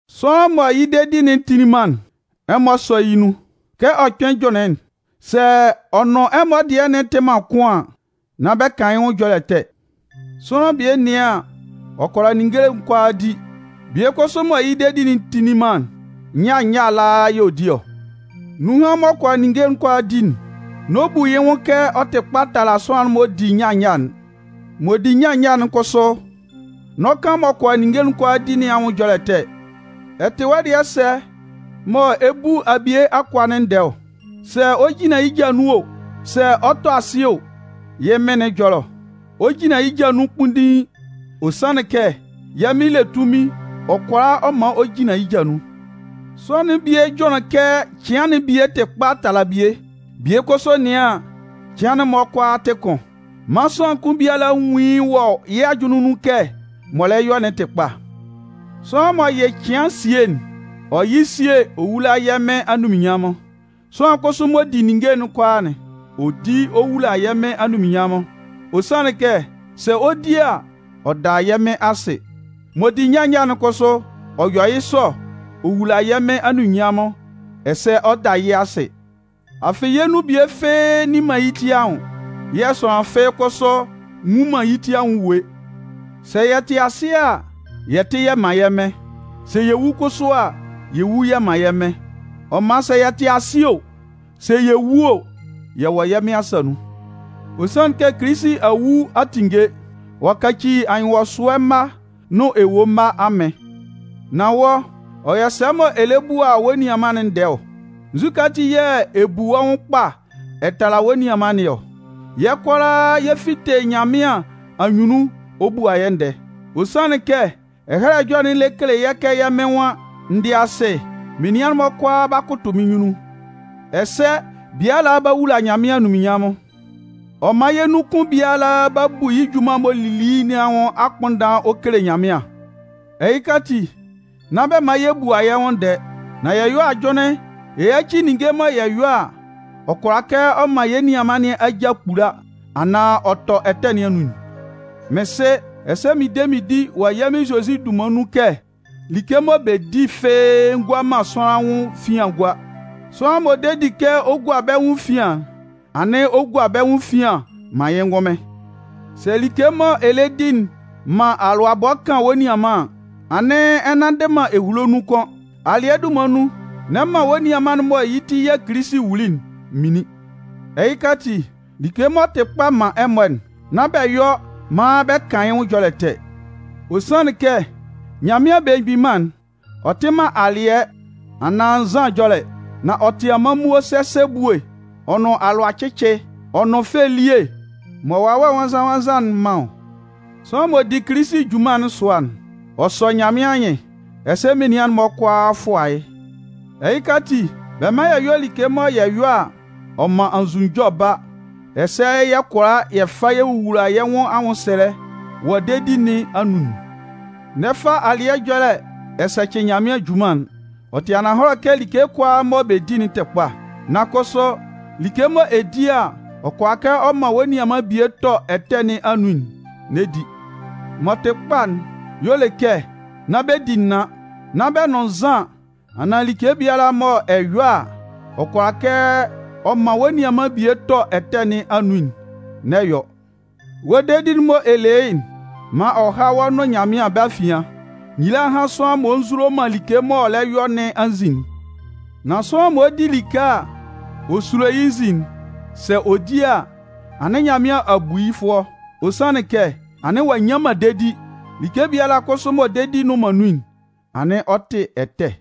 Sʋanlan mɔ yɩ́ dedi'n tinlin man'n, ɛmɔ sɔ́ yɩ́ nun. Kɛ ɔ kpɩn jʋnlɩn'n, sɛ ɔ nʋn ɛmɔ dɩɛ'n tɩ man kʋn an, nán bɛ kan yɩ́ nwʋn ɛjɔlɛ ɛtɛ. Sʋanlan bie nɩan an, ɔ kʋala ninnge kʋalaa di. Bie kʋsʋ mɔ yɩ́ dedi'n tinlin man'n, nyâ nyâ ala yɛ̂ ɔ di ɔ. Nunhan m'ɔ kʋala ninnge kʋalaa di'n, n'ɔ bu yɩ́ nwʋn kɛ ɔ tɩ kpa tala sʋanlan m'ɔ di nyâ nyâ'n. M'ɔ di nyâ nyâ'n kʋsʋ n'ɔ kan m'ɔ kʋala ninnge kʋalaa di nɩn anwʋn ɛjɔlɛ ɛtɛ. Ɛ tɩ wɔ́ dɩɛ sɛ mɔ ɛ bu abie akʋa'n ndɛɛ ɔ? Sɛ ɔ 'jinlan yɩ́ ja nun o, sɛ ɔ 'tɔ asɩ o, yɩ́ Mɩn nɩn ɛjɔlɛ ɔ. Ɔ 'jinlan yɩ́ ja nun kpunndiin. Ɔ sanlɩn kɛ yɛ́ Mɩn le tunmɩn ɔ kʋala ɔ man ɔ jinlan yɩ́ ja nun. Sʋanlan'n bie jʋnlɩn kɛ cɩan'n bie tɩ kpa tala bie. Bie kʋsʋ nɩan an, cɩan'n-mɔ kʋala tɩ kʋn. Man sʋanlan kʋn biala nwún yɩ́ wɔ yɩ́ ajʋnlɩn nun kɛ m'ɔ lɛ yɔ'n tɩ kpa. Sʋanlan m'ɔ yɩ cɩan sie'n, ɔ yɩ sie ɔ wula yɛ́ Mɩn anunminnyanmʋn. Sʋanlan kʋsʋ m'ɔ di ninnge kʋalaa'n, ɔ di ɔ wula yɛ́ Mɩn anunminnyanmʋn. Ɔ sanlɩn kɛ, sɛ ɔ 'di a, ɔ da yɛ́ Mɩn asɩ. M'ɔ di nyâ nyâ'n kʋsʋ, ɔ yɔ yɩ́ sɔ ɔ wula yɛ́ Mɩn anunminnyanmʋn ɛsɛ ɔ da yɩ́ asɩ. Afɩ yɛ nun bie fɩ́ɩ́ nni man yɩ́ ti anwʋn. Yɛ̂ sʋanlan fɩ́ɩ́ kʋsʋ nwu man yɩ́ ti anwʋn ewue. Sɛ yɛ tɩ asɩ a, yɛ tɩ yɛ́ man yɛ́ Mɩn. Sɛ yɛ wu kʋsʋ a, yɛ wu yɛ man yɛ́ Mɩn. Ɔ man sɛ yɛ tɩ asɩ o, sɛ yɛ wu o, yɛ wɔ yɛ́ Mɩn asa nun. Ɔ sanlɩn kɛ Kilisi a wu a tinnge. Ɔ'a kaci anyɩnwɔsʋɛ mma nʋn ewue mma Amɩn. Nan wɔ́, ɔ yɔ sɛ mɔ ɛ lɛ bua wɔ́ nianman'n ndɛɛ ɔ? Nzukɛ ati yɛ̂ ɛ bu wɔ́ nwʋn kpa ɛ tala wɔ́ nianman nɩn ɔ? Yɛ́ kʋalaa yɛ 'fite Nyanmɩan anyunnun ɔ bua yɛ́ ndɛɛ. Ɔ sanlɩn kɛ Ɛhɛlɛ Ɛjɔlɛ'n lɛ kele kɛ yɛ́ Mɩn nwan: N dɩ asɩ, menian'n-mɔ kʋalaa 'ba kʋtʋ mɩ́n nyunnun. Ɛsɛ biala 'ba wula Nyanmɩan anunminnyanmʋn. Ɔ man yɛ́ nun kʋn biala 'ba bu yɩ́ junman'n m'ɔ lili nɩn anwʋn mgbʋnndan ɔ kele Nyanmɩan. Ɛhɩka ati, nán bɛ man yɛ bua yɛ́ nwʋn ndɛɛ. Nan yɛ yɔ́ ajʋnlɩn yɛ yáci like mɔ yɛ yɔ a, ɔ kʋala kɛ ɔ man yɛ́ nianman nɩn aja kpula, anaan ɔ tɔ ɛtɛ nɩn anun'n. Mɩn sɩ, ɛsɛ mɩn de mɩn di wɔ yɛ́ Mɩn Zozi dunman nun kɛ like mɔ bɛ di fɩ́ɩ́ ngua man sʋanlan anwʋn efian gua. Sʋanlan m'ɔ de di kɛ ɔ gua bɛ́ nwʋn efian'n, anɩn ɔ gua bɛ́ nwʋn efian man yɩ́ ngʋnmɩn. Sɛ like mɔ ɛ lɛ di'n man alʋabɔ kan wɔ́ nianman an, anɩn ɛ nnanndɩ man ehulo nun kʋ́n. Alɩɛ dunman nun, n'ɛ man wɔ́ nianman'n mɔ yɩ́ ti yɛ̂ Kilisi wuli'n minlin. Ɛhɩka ati, like m'ɔ tɩ kpa man ɛmɔ'n, nán bɛ yɔ maan bɛ kan yɩ́ nwʋn ɛjɔlɛ ɛtɛ. Ɔ sanlɩn kɛ Nyanmɩan Belemgbin Mân'n, ɔ tɩ man alɩɛ anaan nzan ɛjɔlɛ. Nan ɔ tɩ amanmuo sɛsɛ ebue ɔ nʋn alʋacɩcɩ ɔ nʋn fɛ elie mɔ Wawɛ Nwannzan-nwannzan'n man ɔ. Sʋanlan m'ɔ di Kilisi junman'n sʋa'n, ɔ sɔ Nyanmɩan anyɩn, ɛsɛ menian'n-mɔ kʋalaa fʋa yɩ́. Ɛhɩka ati, bɛ mán yɛ yɔ́ like mɔ yɛ yɔ a, ɔ man anzʋnunjɔ ba, ɛsɛ yɛ kʋala yɛ fa yɛ wowula yɛ́ nwʋn anwʋnsɛlɛ wɔ dedi nɩn anun'n. N'ɛ fa alɩɛ ɛjɔlɛ ɛ sɛcɩ Nyanmɩan junman'n. Ɔ tɩ ananhɔlɛ kɛ like kʋalaa mɔ bɛ di'n tɩ kpa. Nan kʋsʋ, like mɔ ɛ di a, ɔ kʋala kɛ ɔ man wɔ́ nianman bie tɔ ɛtɛ nɩn anun'n, n'ɛ di. M'ɔ tɩ kpa'n y'ɔ le kɛ nán bɛ di naan, nán bɛ nʋn nzan anaan like biala mɔ ɛ yɔ a, ɔ kʋala kɛ ɔ man wɔ́ nianman bie tɔ ɛtɛ nɩn anun'n, n'ɛ yɔ. Wɔ́ dedi'n mɔ ɛ le yɩ́'n, man ɔ há wɔ́ nʋn Nyanmɩan bɛ́ afian. Nyila hán sʋanlan m'ɔ nzulo man like m'ɔ lɛ yɔ nɩn anzin'n! Nan sʋanlan m'ɔ di like a, ɔ sulo yɩ́ nzin'n, sɛ ɔ di a, anɩn Nyanmɩan a bu yɩ́ fʋɔ. Ɔ sanlɩn kɛ anɩn ɔ'a nnyan man dedi. Like biala kʋsʋ mɔ dedi nnʋn man nun'n, anɩn ɔ tɩ ɛtɛ.